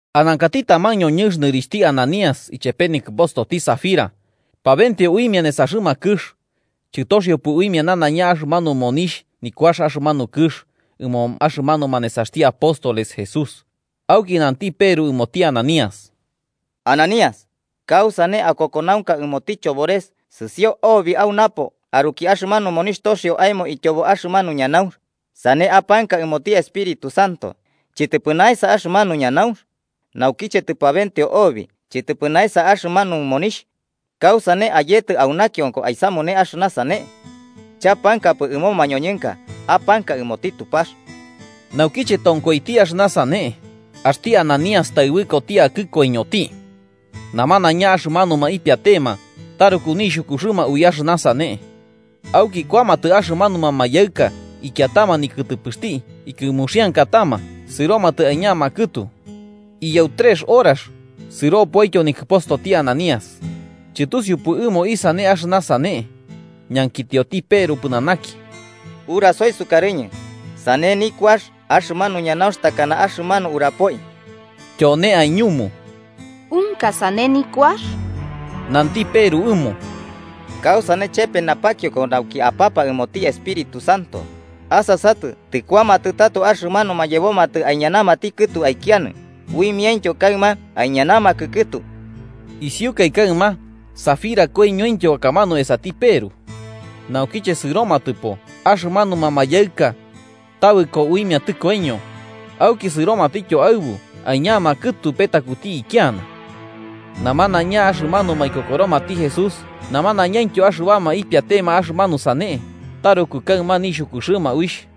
Anankati taman ñoñɨnx nɨrixhti Ananías, ichepe nikɨpostoti Safira, pabenteo uimia nesaxɨma kɨx, chɨtoxiopɨ uimia nanaiña axɨmanu monixh nikuax axɨmanu kɨx ɨmo axɨmanuma nesaxti apóstoles Jesús Auki Nanti Peru ɨmoti Ananías: –Ananías, ¿kausane akokonaunka ɨmoti chobores? Sɨsio obi au napo aruki axɨmanu monixh toxio aemo ityobo axɨmanu ñanaunx, sane apanka ɨmoti Espíritu Santo. ¿Chɨtɨpɨ naesa axɨmanu ñanaunx? Naukiche tɨpabenteo obi, ¿chɨtɨpɨ naesa axɨmanu monixh? ¿Kausane ayetɨ au nakionko aisamune axɨna sane? Chapankapɨ ɨmo mañoñɨnka, apanka ɨmoti Tupax. Naukiche tonkoiti axɨna sane, axti Ananías taɨbɨkoti akɨ koiñoti. Namanaiña axɨmanuma ipiatema, taruku nixhukuxɨma ui axɨna sane. Auki kuamatɨ axɨmanuma mayaɨka ikiatama nikɨtɨpɨxti ikɨmuxiankatama sɨromatɨ aiñama kɨtu. Iyau trex horax, sɨropoityo nikɨpostoti Ananías, chɨtusiupɨ ɨmo isane axɨna sane. Ñankitiotityo Peru pɨnanaki: –Urasoi sukarɨñɨ, ¿sane nikuax axɨmanu ñanaunx takana axɨmanu aburapoi? Tyone aiñumu: –Unka sane nikuax. Nanti Peru ɨmo: –¿Kausane chepe napakionko nauki apapa ɨmoti Espíritu Santo? Asasatɨ tɨkuamatɨ tato axɨmanuma yebomatɨ aiñanamati kɨtu aikianɨ, uimiaintyo kaɨma aiñanamakɨ kɨtu. Isiukaɨ kaɨma Safira koiñointyo akamanu esati Peru. Naukiche sɨromatɨpo axɨmanuma mayaɨka, tabɨko uimia tɨkoiño, auki sɨromatityo aɨbu aiñama kɨtu petakuti ikiana. Namanaiña axɨmanuma ikokoromati Jesús, namanaiñaintyo axɨbama ipiatema axɨmanu sane, taruku kaɨma nixhukuxɨma uixh.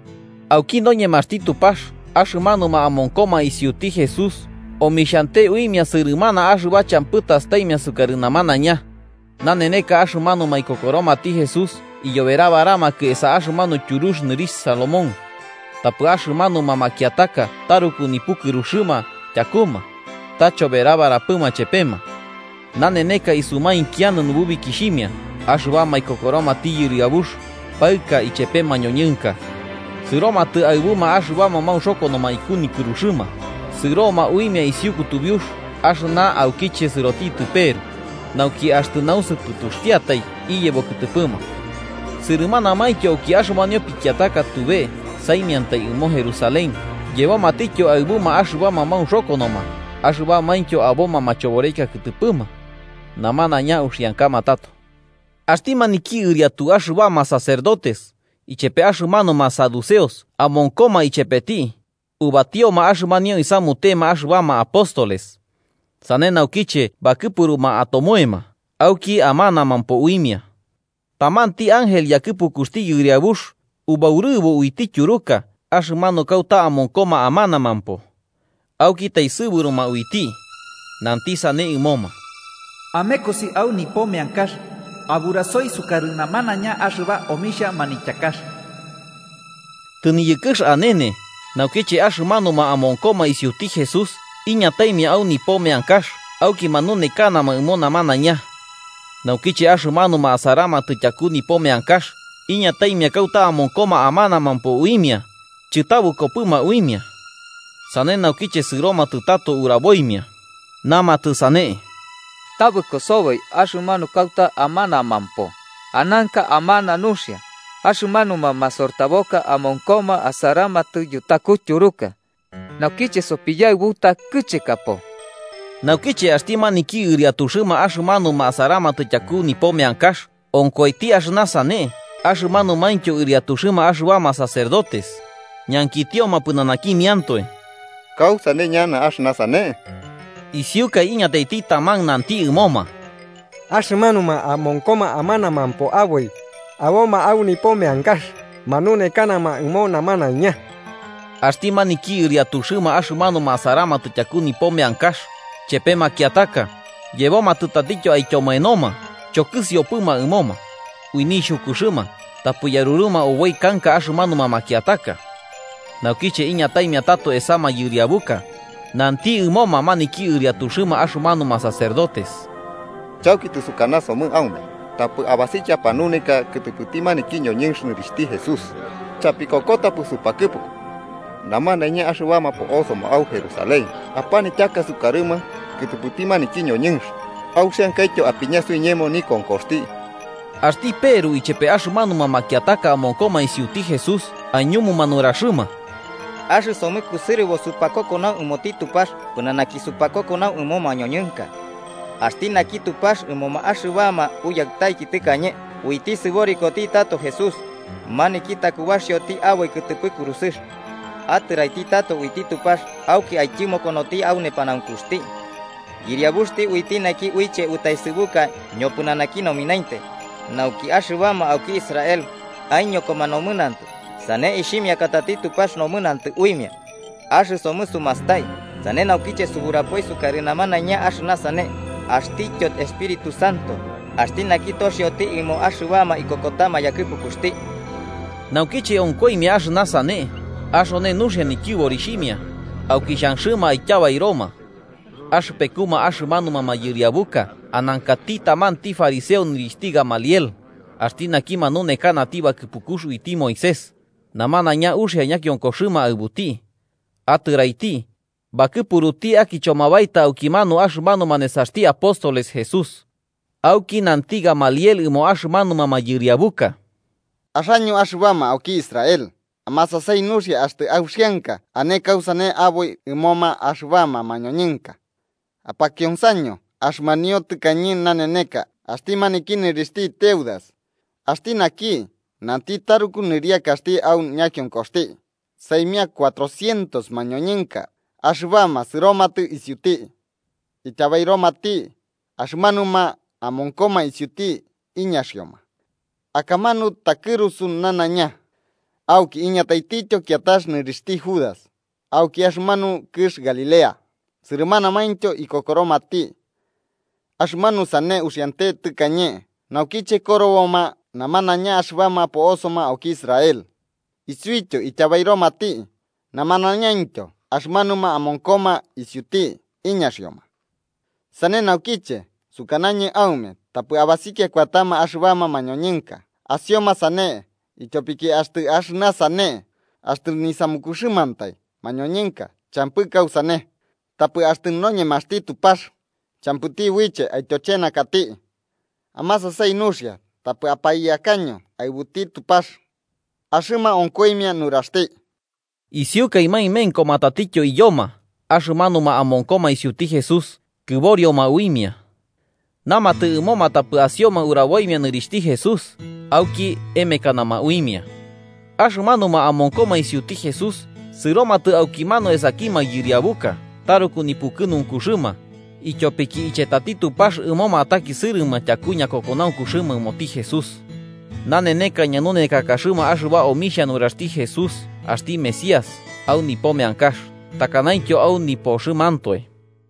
Auki noñemaxti Tupax axɨmanuma amonkoma isiuti Jesús omixhante uimia sɨrɨmana axɨba champɨ tastaimia sukarɨ namanaiña. Naneneka axɨmanuma ikokoromati Jesús iyoberabaramakɨ esa axɨmanu tyurux nɨrixh Salomón. Tapɨ axɨmanuma makiataka taruku nipukɨruxɨma tyakuma, ta choberabarapɨma chepema. Naneneka isumainkianɨ nububikixhimia axɨbama ikokoromati Yɨriabux, paɨka ichepe mañoñɨnka. Sɨromatɨ aɨbuma axɨbama maunxokonoma iku nikɨruxɨma, sɨroma uimia isiu kutubiux axɨna aukiche sɨrotitɨ Peru, nauki axtɨ nausɨpɨtuxtiatai iyebo kɨtɨpɨma. Sɨrɨmanamaintyo auki axɨmanio pikiataka tube saimiantai ɨmo Jerusalén yebomatityo aɨbuma axɨbama maunxokonoma axɨbamaintyo aboma machoboreka kɨtɨpɨma. Namanaiña uxiankama tato. Axti maniki ɨriatu axɨbama sacerdotes, ichepe axɨmanuma saduceos amonkoma ichepeti, ubatioma axɨmanio isamutema axɨbama apóstoles, sane naukiche bakɨpuruma atomoema auki amanamampo uimia. Tamanti ángel yakɨpukuxti Yɨriabux, ubaurɨbo uiti tyuruka axɨmanu kauta amonkoma amanamampo, auki taesɨburuma uiti, nanti sane ɨmoma: “Amekosi au nipo meankax, aburasoi sukarɨ namanaiña axɨba omixha manityakax.” Tɨniyɨkɨx anene naukiche axɨmanuma amonkoma isiuti Jesús iñataimia au nipo meankax auki manunekanama ɨmo namanaiña. Naukiche axɨmanuma asaramatɨ tyaku nipo meankax iñataimia kauta amonkoma amanamampo uimia chɨtabɨkopɨma uimia. Sane naukiche sɨromatɨ tato uraboimia, namatɨ sane: –Tabɨko soboi axɨmanu kauta amanamampo, ananka amana nuxia, axɨmanuma masortaboka amonkoma asaramatɨ yutaku tyuruka. Naukiche sopiyaɨbuta, kɨchekapo. Naukiche axti maniki ɨriatuxɨma axɨmanuma asaramatɨ tyaku nipo meankax onkoiti axɨna sane axɨmanumaintyo ɨriatuxɨma axɨbama sacerdotes, ñankitioma pɨnanakimiantoe kausane ñana axɨna sane. Isiukai iñataiti taman nanti ɨmoma: –Axɨmanuma amonkoma amanamampo aboi, aboma au nipo meankax manunekanama ɨmo namanaiña. Axti maniki ɨriatuxɨma axɨmanuma asaramatɨ tyaku nipo meankax chepe makiataka, yebomatɨ tatityo aityomoenoma, chokɨsiopɨma ɨmoma, ui nixhukuxɨma tapɨ yaruruma oboi kanka axɨmanuma makiataka. Naukiche iñataimia tato esa mayɨriabuka, nanti ɨmoma maniki ɨriatuxɨma axɨmanuma sacerdotes: 28–Chauki tɨsukanasomɨ aume, tapɨ abasikiaiki apanuneka kɨtɨpɨti maniki ñoñɨnx nɨrixhti Jesús, chapikokota supakɨpuku. Namanaiña axɨbama po'osoma au Jerusalén apanityaka sukarɨma kɨtɨpɨti maniki ñoñɨnx, auxiankaityo apiña suiñemo nikonkoxti. Axti Peru ichepe axɨmanuma makiataka amonkoma isiuti Jesús aiñumuma nuraxɨma: –Axɨsomɨ kusɨrɨbo supakokonau ɨmoti Tupax pɨnanaki supakokonau ɨmo mañoñɨnka. Axti naki Tupax ɨmoma axɨbama uyaɨtaiki tɨkañe uiti sɨborikoti tato Jesús, maniki takubaxioti aboi kɨtɨpɨ kurusɨx. Atɨraiti tato uiti Tupax auki aityɨmokonoti au nepanaunkuxti, Yɨriabuxti uiti naki uiche utaesɨbuka ñopɨnanaki nominainte, nauki axɨbama auki Israel aiñokoma nomɨnantɨ sane ixhimiakatati Tupax nomɨnantɨ uimia. Axɨsomɨ sumastai, sane naukiche suburapoi sukarɨ namanaiña axɨna sane, axtityo Espíritu Santo, axti naki toxioti ɨmo axɨbama ikokotama yakɨpukuxti. Naukiche onkoimia axɨna sane, axone nuxia nityɨborixhimia, auki xhanxɨma aityabairoma. Axɨpekuma axɨmanuma mayɨriabuka anankati tamanti fariseo nɨrixhti Gamaliel, axti naki manunekanati bakɨpukux uiti Moisés, namanaiña uxia ñakionkoxɨma aɨbuti. Atɨraiti, bakɨpuruti akichoma baeta aukimanu axɨmanuma nesaxti apóstoles Jesús Auki nanti Gamaliel ɨmo axɨmanuma mayɨriabuka: –Axaño axɨbama auki Israel, amasasai nuxia axtɨ auxianka ane kausane aboi ɨmoma axɨbama mañoñɨnka. Apakionsaño axɨmanio tɨkañe naneneka axti maniki nɨrixhti Teudas, axti naki nanti taruku nɨriakaxti au ñakionkoxti, saimia cuatrocientos mañoñɨnka axɨbama sɨromatɨ isiuti. Ityabairomati, axɨmanuma amonkoma isiuti iñaxioma. Akamanu takɨrusu nanaiña. Auki iñataitityo kiatax nɨrixhti Judas, auki axɨmanu kɨx Galilea, sɨrɨmanamaintyo ikokoromati. Axɨmanu sane uxiante tɨkañe naukiche koroboma namanaiña axɨbama po'osoma auki Israel. Isiuityo ityabairomati, namanaiñaintyo axɨmanuma amonkoma isiuti iñaxioma. Sane naukiche, sukanañɨ aume tapɨ abasikia kuatama axɨbama mañoñɨnka asioma sane ityopiki axtɨ axɨna sane, axtɨ nisamukuxɨmantai mañoñɨnka, champɨ kausane. Tapɨ axtɨ noñemaxti Tupax, champɨti uiche aityochenakati. Amasasai nuxia, tapɨ apaiyakaño aɨbuti Tupax. Axɨma onkoimia nuraxti. Isiukaɨ maemenkoma tatityo iyoma axɨmanuma amonkoma isiuti Jesús, kɨborioma uimia. Namatɨ ɨmoma tapɨ asioma uraboimia nɨrixhti Jesús, auki emekanama uimia. Axɨmanuma amonkoma isiuti Jesús sɨromatɨ aukimanu esaki mayɨriabuka taruku nipukɨnunkuxɨma, ityopiki ichetati Tupax ɨmoma atakisɨrɨma tyaku ñakokonaunkuxɨma ɨmoti Jesús. Naneneka ñanunekakaxɨma axɨba omixhia nuraxti Jesús axti Mesías au nipo meankax takanaintyo au nipoxɨmantoe.